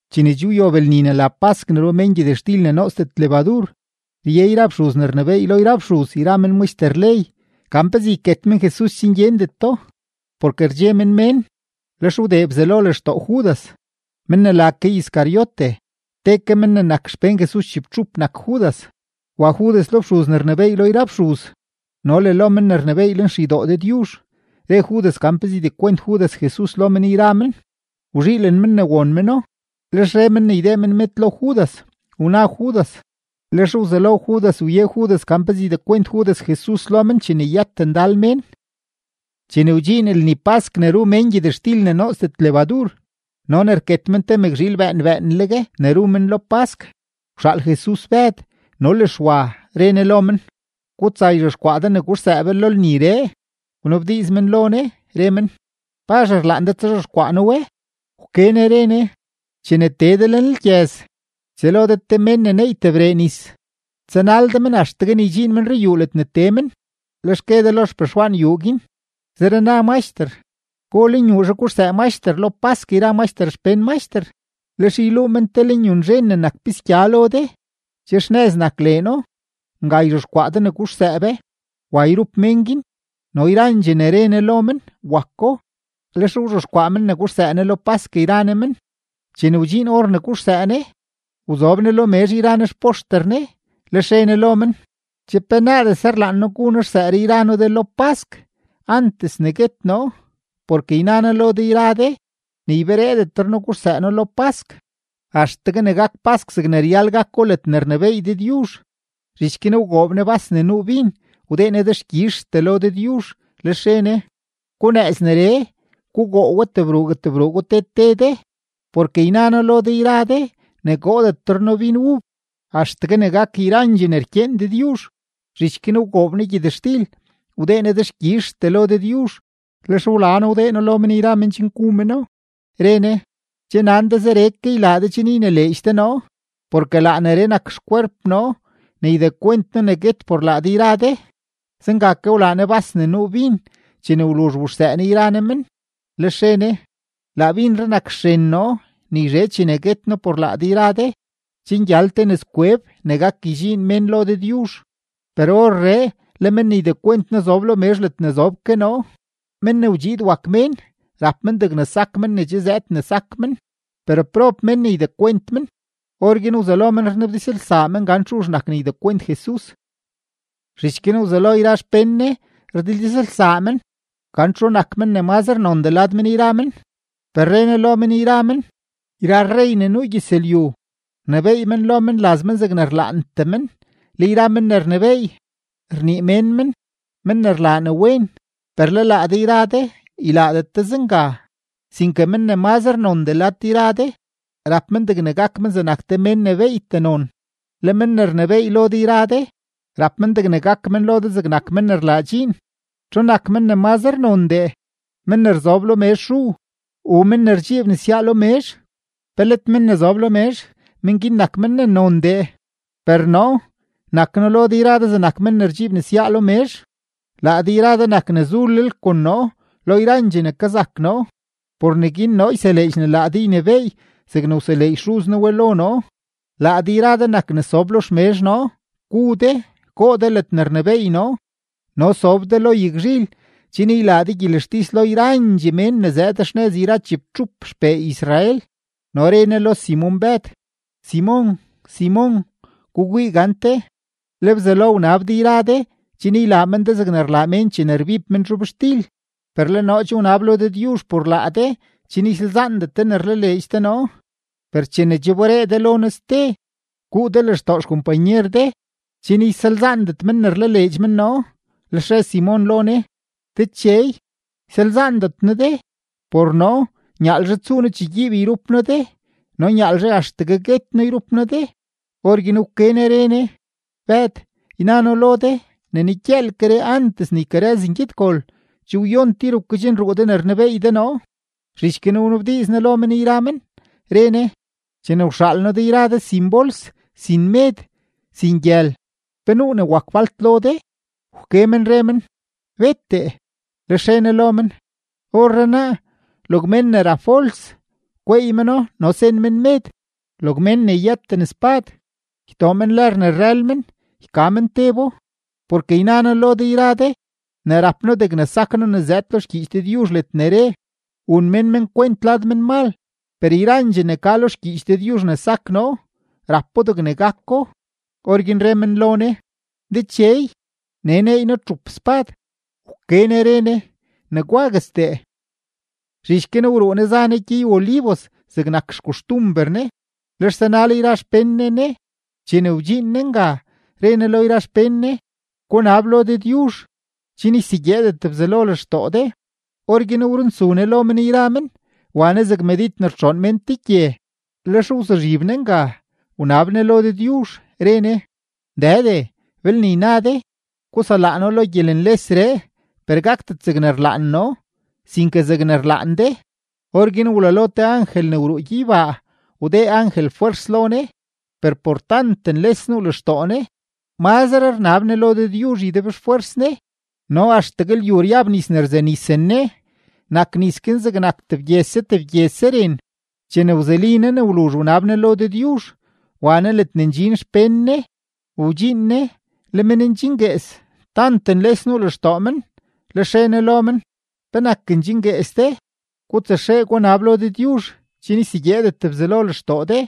Chene che wyob lni ne la pask ne ru mén gyëtxtil ne nootsdet lebadur, rye yra fxuz ne rnebééy lo yra fxuz yra men maxter ley gan pezee yket men Jesus chen gyendeto, porke rdxe men mén. Lex wdee Bzelo lextoo Judas, men ne la ke Iscariote. Te ke men ne nak xpén Jesus chibtxup nak Judas. Wa Judas lo fxuz ne rnebééy lo yra fxuz no le lo men ne rnebééy lenxeydoo Dëdyuzh, re Judas gan pezee ydekwent Judas Jesus lo men yra men. Wzhiilen men ne won meno, lex re men ne ydee men med lo Judas; wna Judas, lex wzelo Judas wye Judas gan pezee ydekwent Judas Jesus lo men chene yët ndal mén. Chene wdxiin lni pask ne ru mén gyëtxtil ne nootsdet lebadur no ne rket men te mëkzhiil bëën bëënleg ne ru men lo pask, wxaal Jesus Bëd no le Xwa, re Ne lo men: ―Gutsa yzhexkwaa de ne guxsëë be lo lniree. Lex wnabdiiz men lo Ne, re men: ―¿Pazh rlaan de tsazhexkwaa noo we? Wke Ne re Ne: ―Chene tee de lenlgyëz, ytsëlo de te mén ne neey tebree nis. Tsanal de men axtegue ne ydxiin men ruyuu ledne tee men; lex gue de lo xpexwaan yuu guin: “Zere na Maxter, ¿go lenyuuzhe guxsëë Maxter lo pask yra Maxter xpén Maxter?” Lex yluu men te lenyunzhen ne nak pisgya lo de, che xnëz nak leeno; nga yzhexkwaa de ne guxsëë be. Wa yrup mén guin, no yrandxee ne re Ne lo men, wako. Lex wzhexkwaa men ne guxsëë Ne lo pask yra Ne men. Chene wdxiin or ne guxsëë Ne, wzob Ne lo mezh yra Ne xpoxter Ne. Lex re Ne lo men: ―¡Che penaadese rlaan noo gu noo xsëëree yra noo de lo pask, antes ne guet noo! Porke yna noo lo de yra de ne ybereedetre noo guxsëë noo lo pask axtegue ne gak pask zegne ryal gako ledne rnebééy Dëdyuzh. Zhich guin wgoob Ne bas ne nuu bin, wdee Ne dexkyizhtee lo Dëdyuzh, lex re Ne: ―Gunëëz neree, gugoo we tebruugue tebruugoo te te de. Porke yna noo lo de yra de ne goodetre noo bin ub axtegue ne gak yrandxee ne rkyeen Dëdyuzh. Zhich guin wgoob Ne gyëtxtil, wdee Ne dexkyizhtee lo Dëdyuzh, lex wla No wdee No lo men yra men chen gu meno, re Ne: ―Che nan de zeree ke ylaa de chen ynileedx de noo, porke laa neree nak xkwerp noo ne ydekwent noo ne guet por laa de yra de. Zenga ke wlaa Ne bas ne nuu bin chene wluzh wuxsëë Ne yra Ne men, lex re Ne: ―Laa binree nak xren noo ne yzhe chene guet noo por laa de yra de, chen gyal te nëzkweb ne gak ydxiin mén lo Dëdyuzh. ’Per orree le men ne ydekwent noo zob lo mezh ledne zob ke noo. Men ne wdxiid wak Mén rap men degne sak men ne che zëëd men ne sak men; per ¡prob mén ne ydekwent men! Orguin wzelo men rnabdizlsaa men gan txu nak ne ydekwent Jesus. Zhich guin wzelo yra xpén Jesus rdildizlsaa men gan txu men nak men ne mazre nondee lad men yra men. Per re Ne lo men yra men: ―Yra rrey ne nuu gyëzlyu, rnebééy men lo menlaz men zegne rlaantee men. Le yra men ne rnebééy, rnii mén men “men ne rlaa ne wen”. Per le laa de yra de ylaadet de zenga. Sinke mén ne mazre nondee lad de yra de, rap men degne gak men zegnak te mén ne beeytee non; le men ne rnebééy lo de yra de, rap men degne gak men lo de zegnak men ne rlaa dxiin. ¿Txu nak men ne mazre nondee, men ne rzob lo mezh ru u men ne rdxiib nesyaa lo mezh? ¿Pe let men ne zob lo mezh, men guin nak ne nondee? Per noo, nak noo lo de yra de zegnak men ne rdxiib nesyaa lo mezh. ’Laa de yra de nak ne zulel kon noo lo yrandxee ne kazak noo. Por neguin noo yseleedx ne laa de ynebééy zegne wseleedx Xuz noo we lo noo. Laa de yra de nak ne sob lo xmezh noo, gu de, goo de ledne rnebééy noo, no sob de lo yagzhil chen ylaa de gyelextis lo yrandxee men ne zëëd xnëz yra chibtxup xpee Israel. No re Jesus lo Simon-Bëd: ―Simon, Simon, gukwii gante, le Bzelo wnab de yra de chen ylaa men de zegne rlaa mén chene rbib men zhobxtil; per le noo che wnab lo Dëdyuzh por laa de chen ysalzaandet de ne rlaleedx de noo. Per chene che wberee de lo noo ste, guu de lextoo xkompanyer de chen ysalzaandet men ne rlaleedx men noo. Lex re Simon lo Ne: ―Dechey, ysalzaandet noo de, por noo nyaalzhe tsuu noo chegyiib yrup noo de no nyaalzhe axtegue guet noo yrup noo de. Orguin wke Ne re Ne: ―Bëd, yna noo lo de ne negyëëlkeree, antes ne ykarëz ngyedgol, che wyon tir wkedxnruu de ne rnebeey de noo. Zhich guin wnabdiiz Jesus lo men yra men, re Ne: ―Chene wxaal noo de yra de sin bols, sin med, sin gyël, ¿pe nuu ne wak falt lo de? Wke men re men: ―Bettee. Lex re Ne lo men: ―Orrenaa, log mén ne rap bols, gweey meno no sen men med; log mén ne yëten spad, ytoo men lër ne rrël men, yka men tebo. Porke yna noo lo de yra de ne rap noo degne sak noo ne zëëd lo xgyiich Dëdyuzh ledne re: “Wun mén men kwent lad menmal.” Per yrandxee ne ka lo xgyiich Dëdyuzh ne sak noo, rapo degne gako. Orguin re men lo Ne: ―Dechey, nee neey noo txup spad. Wke Ne re Ne: ―Negwaguestee. Zhich guin wruu Jesus, za Ne gyey-Olivos zegnak xkoxtumber Ne. Lex zanal yra xpén Ne Ne. Chene wdxiin Ne nga, re Ne lo yra xpén Ne: ―Gunab lo Dëdyuzh, chen ysegyeedet Bzelo lextoo de. Orguin wrunsu Ne lo men yra men, wa Ne zeg medid ne rtxoon mén te gye. Lex wzuzhib Ne nga, wnab Ne lo Dëdyuzh. Re Ne: ―Dëde, belne yna de, guselaa noo lo gyelenlesree; per gakdet zegne rlaan noo, sinke zegne rlaan de. Orguin wlalo te angel ne wruu gyeybaa, wdee angel fwers lo Ne. Per por tant nles nuu lextoo Ne, mazre rnab Ne lo Dëdyuzh ydebxfwers Ne, no axtegue lyu ryab nis ne rzenisen Ne; nak nis guin zegnak tebgyese tebgyese ren. Chene wzuli Ne ne wluzh wnab Ne lo Dëdyuzh, wa Ne ledne ndxin xpén Ne. Wdxiin Ne, le men ndxinguees, tant nles nuu lextoo men. Lex re Ne lo men: ―¿Penak ndxinguees de? Gutsaxee, gunab lo Dëdyuzh, chen ysegyeedet Bzelo lextoo de.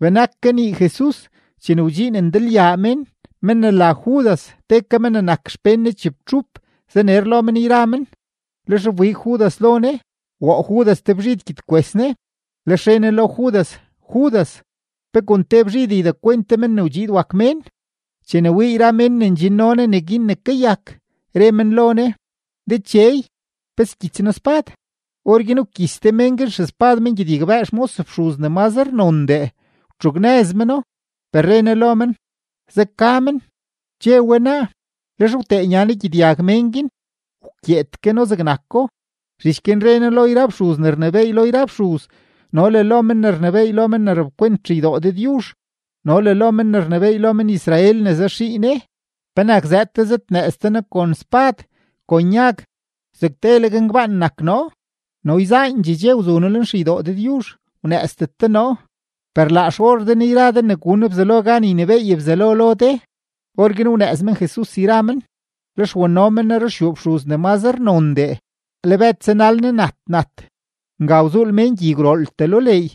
Benak kanii Jesus chene wdxiin ndalyaa mén. Men ne la Judas te ke men ne nak xpén Ne chibtxup zaner lo men yra men, lex wbig Judas lo Ne, woo Judas te bzhid gyedkwes Ne. Lex re Ne lo Judas: ―Judas, ¿pe kon te bzhid ydekwent de Men ne wdxiid wak Mén? Chene wii yra men ne ndxinno Ne neguin ne kayak, re men lo Ne: ―Dechey, ¿pe skyits noo spad? Orguin wkyits te men guin xespad men gyedyagbëë xmos fxuz ne mazre nondee, wtxugnëz meno. Per re Ne lo men: ―Zeka men; che we naa. Lex wtee nya Ne gyedyag mén guin, wkyeed ke No zegnako. Zhich guin re Ne lo yra fxuz ne rnebééy lo yra fxuz no le lo men ne rnebééy lo men ne rapkwent xeydoo Dëdyuzh no le lo men ne rnebééy lo men-Israel ne zaxii Ne: ―¿Penak zëëd de zëdnëëz de noo kon spad, kon yag, zeg teleg ngbaan nak noo? No yzaandxee dxe wzu noo lenxeydoo Dëdyuzh, wnëëzdet de noo; per laa xor de nee yra de ne gun Bzelo gan ynebééy Bzelo lo de. Orguin wnëëz men Jesus yra men, lex wano men Ne ruxyuu fxuz ne mazre nondee. Le Bëd zanal Ne nat nat. Nga wzuul mén gyi gwrooltee lo leey,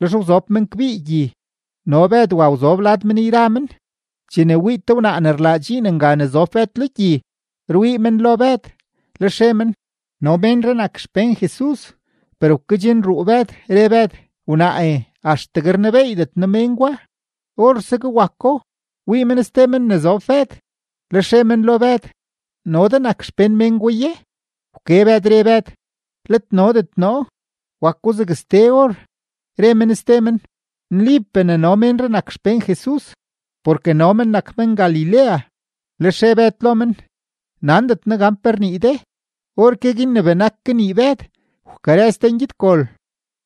lex wzob men kbii gyi, no Bëd wa wzob lad men yra men. Chene wii te wnaa ne rlaa dxiin nga ne zob Bëd lo gyi, rwii men lo Bëd, lex re men: ―No ménree nak xpén Jesus. Per wkedxnruu Bëd, re Bëd: ―Wnaae, axtegue rnebeeydet noo mén gwa. Orsegue wako, wii men ste men ne zob Bëd, lex re men lo Bëd: ―¿No de nak te xpén men gwa ye? Wke Bëd, re Bëd: ―Let nodet noo. Wako zeg ste or, re men ste men: ―Nlipee ne no ménree nak te xpén Jesus, porke no men nak men-Galilea. Lex re Bëd lo men: ―Nandet noo gan pe rnii de. Orke guin ne benak kanii Bëd, wkarëz te ngyedgol.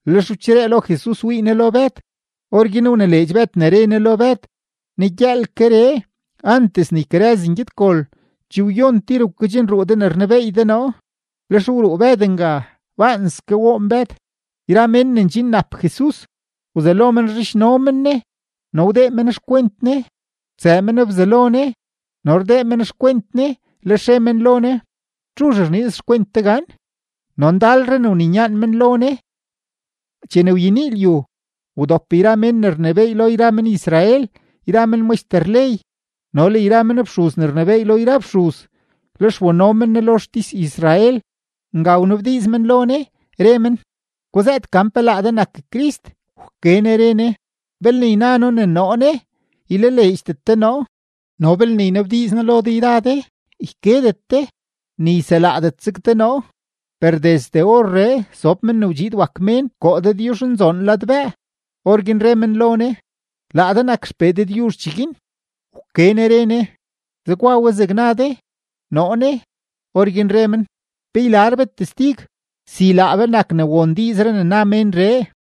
Lex wcheree lo Jesus wii Ne lo Bëd. Orguin wnileedx Bëd ne re Ne lo Bëd: “Negyëëlkeree, antes ne ykarëz ngyedgol, che wyon tir wkedxnruu de ne rnebeey de noo.” Lex wruu Bëd nga; baanske woon Bëd. Yra mén ne ndxinnap Jesus, wzelo men rzhidxno men Ne no wdee men xkwent Ne. Wtsëë men bzalo Ne no rdee men xkwent Ne, lex re men lo Ne: ―¿Txu rniiz xkwent de gan? No ndalre ne wninyaan men lo Ne. Chene wyenii lyu, wdop yra men ne rnebééy lo men-Israel yra men maxter ley no le yra men fxuz ne rnebééy lo yra fxuz, lex wano men Jesus lo xtis-Israel. Nga wnabdiiz men lo Ne, re men: ―Guzëët gan pe laa de nak Crist. Wke Ne re Ne: ―Belne yna noo ne noo ne, ylaleedxdet de noo. No belne ynabdiiz noo lo de yra de, ykedet de, ni yselaadetzeg de noo. Per desde orree sob Men ne wdxiid wak Mén koo Dëdyuzhnzoon ladbëë. Orguin re men lo Ne: ―¿Laa de nak XPee Dëdyuzh cheguin? Wke Ne re Ne: ―Zegwa we zeg na de. Noo ne. Orguin re men: ―Pe ylar be testig si laa be nak ne won diizree ne na ménree.